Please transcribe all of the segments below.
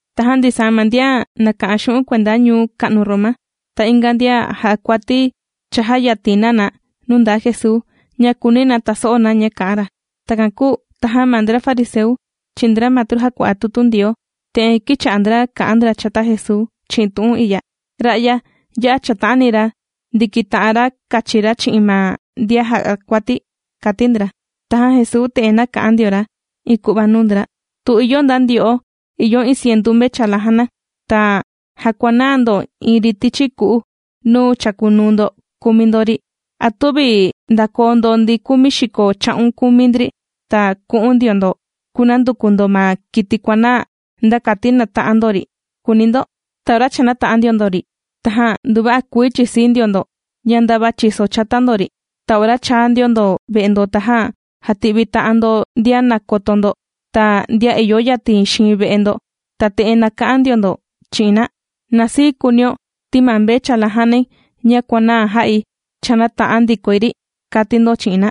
Tajan ndisaa ma ndian nàka'an xu'un' kuenda ñuu ka'nu Roma, ta inga ndian jà'a kuati cha jāyatin na na nuu nda Jesuu ña kùuni na taso'o na ña kà'an ra. Takan kūu tajan ma ndra fariseu chi'in ndra matru jàkua'a tutu Ndioo, te'en kīcha'a ndra kà'an ndra chata Jesuu chi'in tu'un i'ya: ―Ra'ya ya'a ga chàta'ani ra ndikita'an ra kachi ra chi'in ma ndian jà'a kuati ―kàti ndra. Tajan Jesuu te'en nāka'an ndio ra iin ku'va nuu ndra: ―Tu ìyo nda ndyo'o ìyo iin cientu mvechala jàna, ta jàkuanaa ndo iin ri tichi ku'u nuu chàkunuu ndo kùmi ndo ri, ¿a tüvi ndakoo ndo ndi kumi xiko cha'un kumi ndri ta ku'un ndio ndo kunanduku ndo ma kiti kuànaa nda kati nata'an ndo ri?, kùuni ndo. Ta ora cha nāta'an ndio ndo ri, tajan nduva'a kuii chìsii ndio ndo ña ndava chìso chata ndo ri. Ta ora chàa ndio ndo ve'e ndo, tajan jàti'vi ta'an ndo ndian nàkoto ndo ta ndian ìyo yatin xiin ve'e ndo, ta te'en nàka'an ndio ndo chi'in na: “Na sii kuunio ti ma mvechala jànai ña kuànaa jā'i cha nāta'an ndikoi ri”, kàti ndo chi'in na.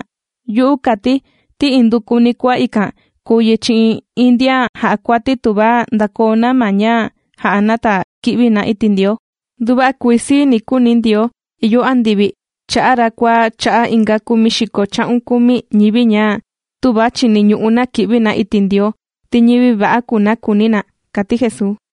Yu'u kàti ti indukuni kua ikan kùu yi chi'in iin ndian jà'a kuati tuva ndàkoo na ma ña jà'a na ta ki'vi na iti' Ndioo. Nduva'a kuii sii ni kuuni Ndioo ìyo andivi cha'a' ra kua cha'a' inga kumi xiko cha'un kumi ñivi ña tüva chiniñu'u na ki'vi na iti' Ndioo, ti ñivi va'a kùu na kùuni na ―kàti Jesuu.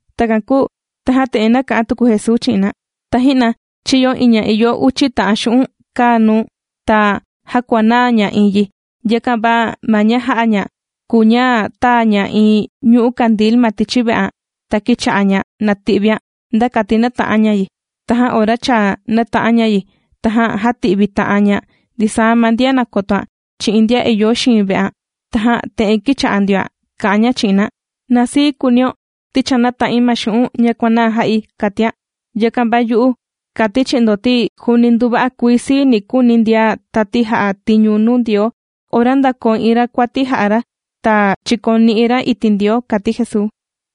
Takan kūu tajan te'en nāka'an tuku Jesuu chi'in na: ―Taji'na chīyo iin ña ìyo uchi ta'an xu'un' kaa nuu, ta jākuanaa ña iin yi. Yakan va ma ña jā'a ña kùu ña tāa ña iin ñu'ú kandil ma tichi ve'an, ta kīcha'a ña nàti'vian nda kati nata'an ña yi. Tajan ora cha nāta'an ña yi, tajan jāti'vi ta'an ña ndisaa ma ndian nàkotoan chi'in ndian ìyo xiin ve'an, tajan te'en kīcha'a ndioan kà'an ña chi'in na: “Na sii kuunio ti cha nāta'in ma xu'un' ña kuànaa jā'i”, kàtian. Yakan va yu'u kàti̱ chi'in ndo ti juuni nduva'a kuii sii ni kuuni ndian tati jà'a tiñu nuu Ndioo ora ndakoo iin ra kuati jà'a ra ta chìkoni'i ra iti' Ndioo ―kàti Jesuu.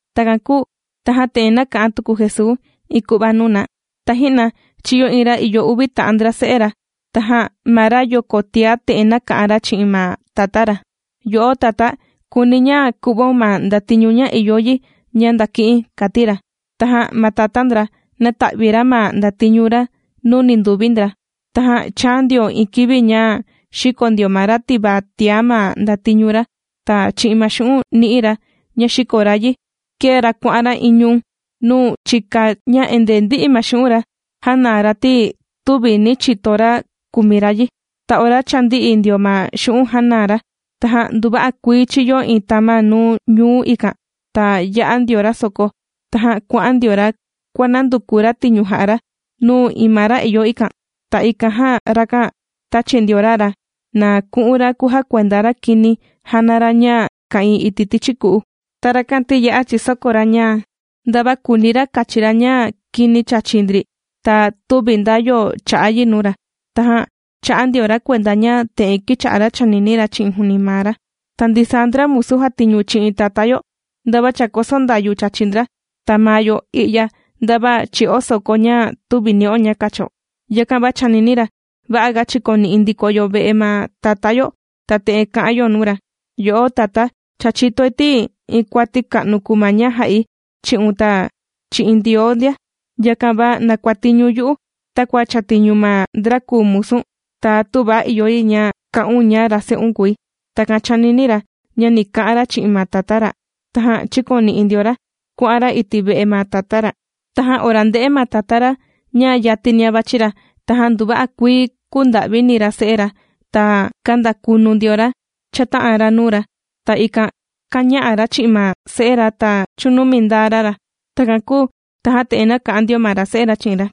Takan kūu tajan te'en nāka'an tuku Jesuu iin ku'va nuu na: ―Taji'na chīyo iin ra ìyo uvi ta'an ndra se'e ra. Tajan ma rayoko tiá te'en nāka'an ra chi'in ma tatá ra: “Yo'o tatá, kùuni̱ ña ku'vaun ma ndatiñu ña ìyo yi ña ndaki'i̱n”, kàti ra. Tajan ma tatá ndra nāta'vi ra ma ndatiñu ra nuu ninduvi ndra. Tajan chāa ndio iin kivi ña xìko ndio ma ra tivaa tiá ma ndatiñu ra. Ta chi'in ma xu'un' nī'i ra ña xīko ra yi kēe ra kuà'an ra iin ñuu nuu chika ña endee ndī'i ma xu'un' ra jānaa ra ti tüvi nī chito ra kumi ra yi. Ta ora cha ndī'i ndio ma xu'un' jānaa ra, tajan nduva'a kuii chīyo iin tama' nuu ñuu ikan ta yā'a ndio ra soko. Tajan kuà'an ndio ra kuànanduku ra tiñu jà'a ra nuu iin ma ra ìyo ikan. Ta ikan jan rakan tāchi ndio ra ra na ku'un ra kujakuenda ra kini jàna ra ña ka'ìin iti' tichi ku'u. Ta rakan ti ya'a chìsoko ra ña ndava kùuni ra kachi ra ña kini chàchi ndri ta tüvi nda yo chà'a yi nuu ra. Tajan chā'a ndio ra kuenda ña te'en kīcha'a ra chànini ra chi'in juuni maa ra: “Ta ndisaa ndra musu jàtiñu chi'in tatá yo, ndava chàkoso ndayu chàchi ndra, ta maa yo i'ya ndava chì'o soko ña tüvi ni'o ña kacho.” Yakan va chānini ra: “Va'a ga chikoni'i ndiko yo ve'e ma tatá yo ta te'en kà'an yo nuu ra: Yo'o tatá, cha chìtoi ti iin kuati ka'nu kùu ma ña jā'i chi'un ta chi'in Ndioo ndia. Yakan va na kuàtiñun yu'u takua chàtiñu ma ndra kùu musu̱n ta tüva ìyo yi ña ka'un ña ra se'un kùi.” Takan chānini ra ña ni ka'an ra chi'in ma tatá ra. Tajan chīkoni'i ndio ra kuà'an ra iti' ve'e ma tatá ra. ’Tajan ora ndē'e ma tatá ra ña yatinia vàchi ra, tajan nduva'a kuii kūnda'vini ra se'e ra ta kāndakunu ndio ra chāta'an ra nuu ra, ta ikan kāña'a ra chi'in ma se'e ra ta chūnumi ndaa ra ra. Takan kūu tajan te'en nāka'an ndio ma ra se'e ra chi'in ra: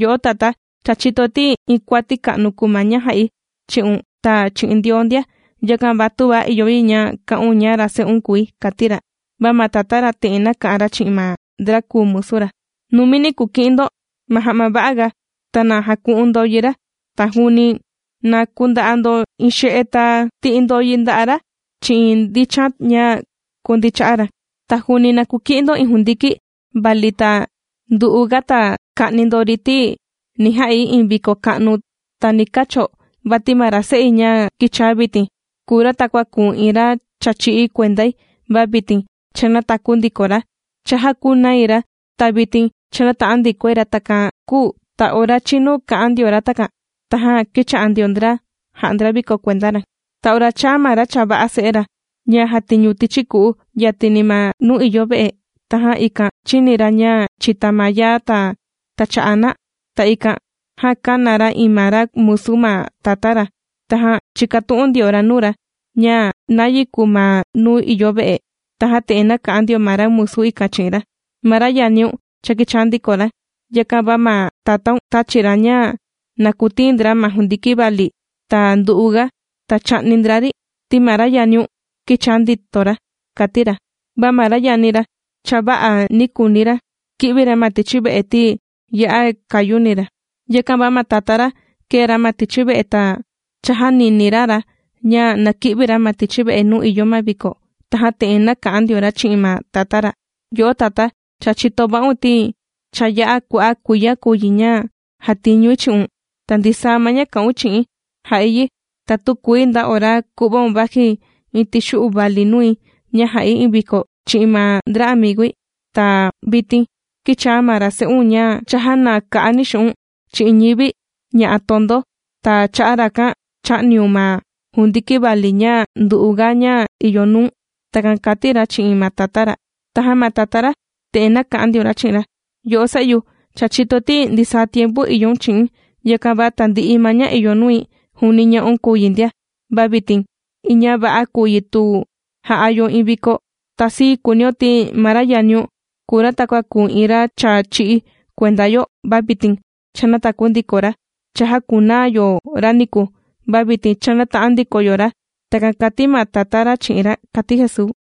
“Yo'o tatá, cha chìtoi ti iin kuati ka'nu kuu ma ña jā'i chi'un ta chi'in Ndioo ndia. Yakan va tüva ìyo yi ña ka'un ña ra se'un kùi”, kàti ra. Va ma tatá ra te'en nāka'an ra chi'in ma ndra kùu musu ra: “¡Numini kuki'in ndo ma ja'ma va'a ga ta na jaku'un ndo yi ra! Ta juuni na kunda'a ndo iin xe'e ta ti'i ndo yi nda'a' ra chi'in ndichan ña kundii cha'a ra. Ta juuni na kuki'in ndo iin jundiki vali ta ndu'u ga ta ka'ni ndo ri, ti ni ja'i iin viko ka'nu ta ni kacho, vati ma ra se'i ña kīchaa vitin kùu ra takua kùu iin ra cha chī'í kuendai va vitin cha nātaku ndiko ra, cha jākunai ra ta vitin cha nāta'an ndikoi ra.” Takan kūu ta ora chīnu kà'an ndio ra takan tajan kīcha'a ndio ndra jà'a ndra viko kuenda ra. ’Ta ora chāa ma ra chava'a se'e ra ña jàtiñu tichi ku'u yatini ma nuu ìyo ve'e, tajan ikan chīni ra ña chìta ma yaa ta tàcha'a na, ta ikan jan kāna ra iin ma ra musu ma tatá ra, tajan chīkatu'un ndio ra nuu ra ña nayi kuu ma nuu ìyo ve'e. Tajan te'en nāka'an ndio ma ra musu ikan chi'in ra. “Ma ra yaniun cha kīchaa ndiko ra. Yakan va ma tatáun tāchi ra ña na kutiin ndra ma jundiki vali ta ndu'uga ta chā'ni ndra ri ti ma ra yaniun kīchaa ndito ra”, kàti ra. Va ma ra yani ra chava'a nī kuuni ra ki'vi ra ma tichi ve'e ti ya'a kàyuni ra. Yakan va ma tatá ra kēe ra ma tichi ve'e ta chājanini ra ra ña na ki'vi ra ma tichi ve'e nuu ìyo ma viko. Tajan te'en nāka'an ndio ra chi'in ma tatá ra: “Yo'o tatá, cha chìto va'un ti cha ya'a kua'a' kuiya kùu yi ña jàtiñui chi'un, ta ndisaa ma ña kà'un chi'i̱n jà'i yi, ta tükuii nda ora kuva'un vaji iin tixu'u vali nui ña jà'i iin viko chi'in ma ndra amigui. Ta vitin kīchaa ma ra se'un ña chājanaa ka'ani xu'u̱n' chi'in ñivi ña'a tondo, ta cha'a' rakan chā'niun ma jundiki vali ña ndu'uga ña ìyo nuu̱n.” Takan kàti ra chi'in ma tatá ra. ’Tajan ma tatá ra te'en nāka'an ndio ra chi'in ra: “Yo'o se'yu, cha chìtoi ti ndisaa tiempu ìyoun chi'i̱n, yakan va tandi'i ma ña ìyo nui juuni ña'un kùu yi ndia. Va vitin iin ña va'a kùu yi tu ja'a yo iin viko. Ta sii kuunio ti ma ra yaniun kùu ra takua kùu iin ra cha chī'í kuenda yo va vitin cha nātaku ndiko ra. Cha jākunaa yo ra niku va vitin cha nāta'an ndiko yo ra.” Takan kàti ma tatá ra chi'in ra ―kàti Jesuu.